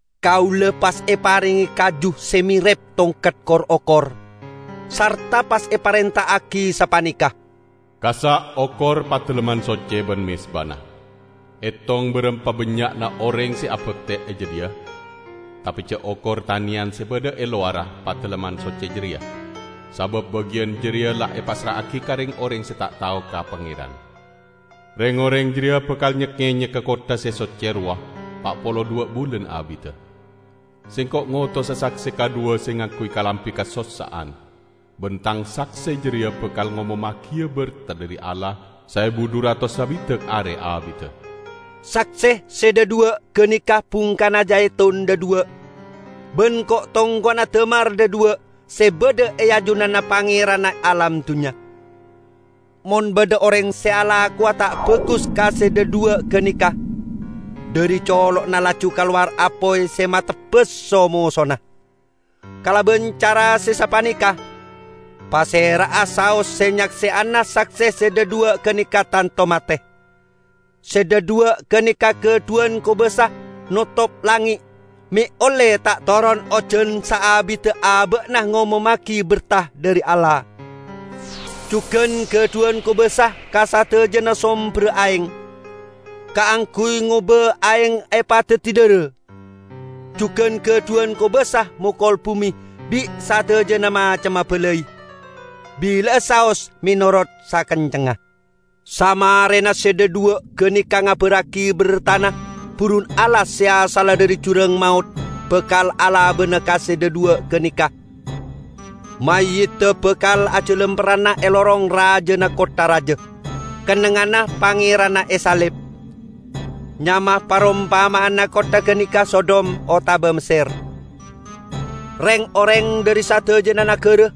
Kaula pas eparenge kaju se merep tongket kor-okor, sarta pas eparenta'agi sapaneka, "Kassa' okor Padalemman Socce ban mezbana. Etong barampa bannya'na oreng se abakte e jadhiya. Tape ja' okor taneyan se badha e lowarra Padalemman Socce jareya, sabab bagiyan jareya la epassra'agi ka reng-oreng se ta' tao ka Pangeran. Reng-oreng jareya bakal nyek-ngenyegga kottha se socce rowa pa' polo dhuwa' bulan abidda. Sengko' ngotosa sakse kadhuwa se ngangguy kalambi kasossa'an, ban Tang sakse jareya bakal ngomommagiya berta dhari Allah saebu dhu ratos sabidak are abidda." Sakse se dhadhuwa' ganeka bungkana jaitun dhadhuwa' ban ko'-tongko'na damar dhadhuwa' se badha e ajunanna Pangeranna alam dunnya. Mon badha oreng se alakowa ta' bagus ka se dhadhuwa' ganeka, dhari colo'na laju kalowar apoy se matebas so-mosona. Kalaban cara se sapaneka, pasera'a saos se nyake'ana sakse se dhadhuwa' ganeka tanto mate. Se dhadhuwa' ganeka gadhuwan kobasa notop langnge' me' olle ta' toron ojan saabidda aba'na ngomommagi berta dhari Allah. Jugan gadhuwan kobasa ka sadajana somberra aeng, kaangguy ngoba aeng epadaddi dhara. Jugan gadhuwan kobasa mokol bume bi' sadajana macemma balai, bila'a saos menorot sakencengnga. Samarena se dhadhuwa' ganeka ngabarragi bertana, burun alas se asalla dhari jurang maot bakal alabana ka se dhadhuwa' ganeka. Mayyidda bakal ajalamperranna e lorong rajana kottha raja, kennengnganna Pangeranna esalib. Nyama parompama'anna kottha ganeka Sodom otaba Messer. Reng-oreng dhari sadajana nagara,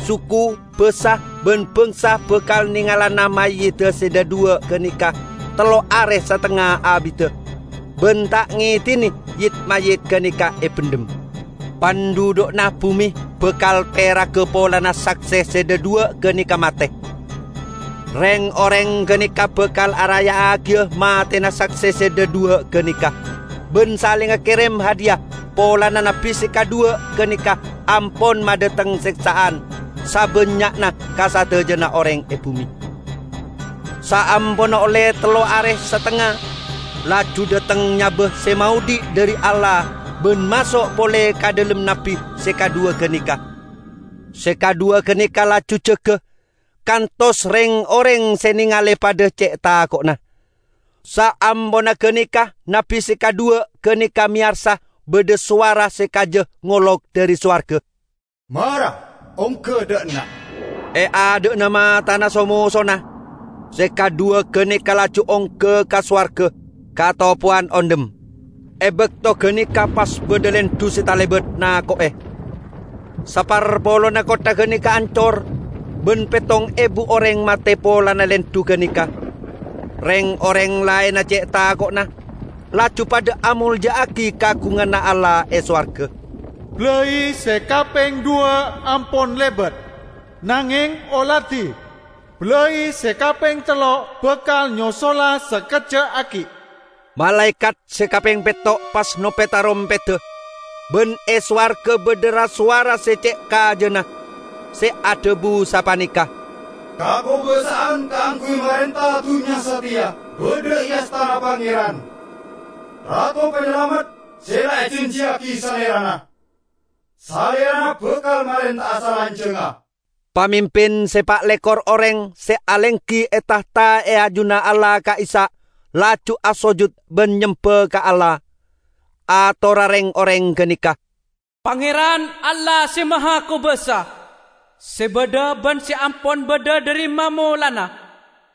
suku, basa ban bangsa bakal nengalana mayyidda se dhadhuwa' ganeka tello are satengnga abidda, ban ta' ngedine yit-mayyit ganeka ebendhem. Pandhudhu'na bume bakal peraga polana sakse se dhadhuwa' ganeka mate. Reng-oreng ganeka bakal araya'agiya matena sakse se dhadhuwa' ganeka ban salenga kerem hadiya polana nabbi se kadhuwa ganeka ampon madhateng seksa'an sabannya'na ka sadajana oreng e bume. Saamponna olle tello are satengnga laju dhateng nyaba se maodhi' dhari Allah ban maso' pole ka dhalem nabbi se kadhuwa ganeka. Se kadhuwa ganeka laju jaga, kantos reng-oreng se nengale padha ce' tako'na. Saamponna ganeka nabbi se kadhuwa ganeka meyarsa badha sowara se kaja ngolok dhari sowarga, "Mara ongga dha' enna'!" E adha'na matana so-mosona, se kadhuwa ganeka laju ongga ka sowarga, katopowan ondhem. E bakto ganeka pas badha lendhu se talebat nako'e. Saparpolonna kottha ganeka ancor, ban pettong ebu oreng mate polana lendhu ganeka. Reng-oreng laenna ce' tako'na, laju padha amolja'agi kaagunganna Allah e sowarga. Balai se kapeng dhuwa' ampon lebat. Nangeng, oladi! Balai se kapeng tello' bakal nyosola sakejja' aggi'. Malaekat se kapeng petto' pas nope tarompedda, ban e sowarga badha ra-sowara se ce' kajana, se adhabu sapaneka, "Kakobasa'an kaangguy marenta dunnya sateya badha e astana Pangeran, Rato Panyalamet se la ejanjiyagi Salerana. Salerana bakal marenta'a salanjangnga!" Pamimpin se pa' lekor oreng se alenggi e tahta e ajunanna Allah ka'issa' laju asojut ban nyemba ka Allah. Atorra reng-oreng ganeka, "Pangeran, Allah Se Mahakobasa, se badha ban se ampon badha dhari mamolanna!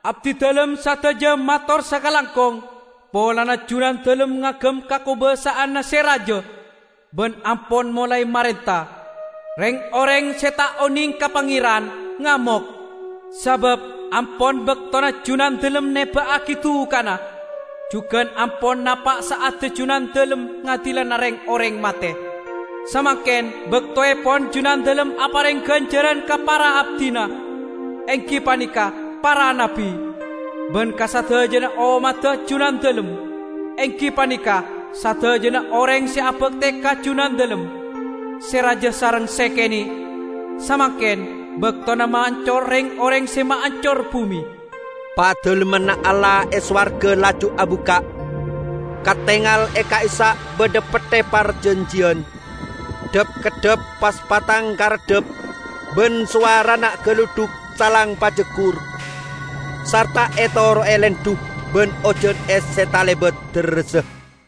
Abdidalem sadaja mator sakalangkong polana Junandalem ngagem kakobasa'anna se raja, ban ampon molae marenta! Reng-oreng se ta' oneng ka Pangeran ngamok, sabab ampon baktona Junandalem neba'agi dukana, jugan ampon napa' sa'adda Junandalem ngadilana reng-oreng mate. Samangken baktoepon Junandalem apareng ganjaran ka para abdina, enggi paneka para nabbi, ban ka sadajana ommadda Junandalem, enggi paneka sadajana oreng se abakte ka Junandalem, se raja sareng se kene'. samangken baktona maancor reng-oreng se maancor bume!" Padalemmanna Allah e sowarga laju abukka', katengal e ka'issa' badha Petthe Parjanjiyan. Dhap-keddhap pas patang kareddhap ban sowarana galudhuk saleng pajaggur, sarta etoro'e lendhu ban ojan es se talebat derressa.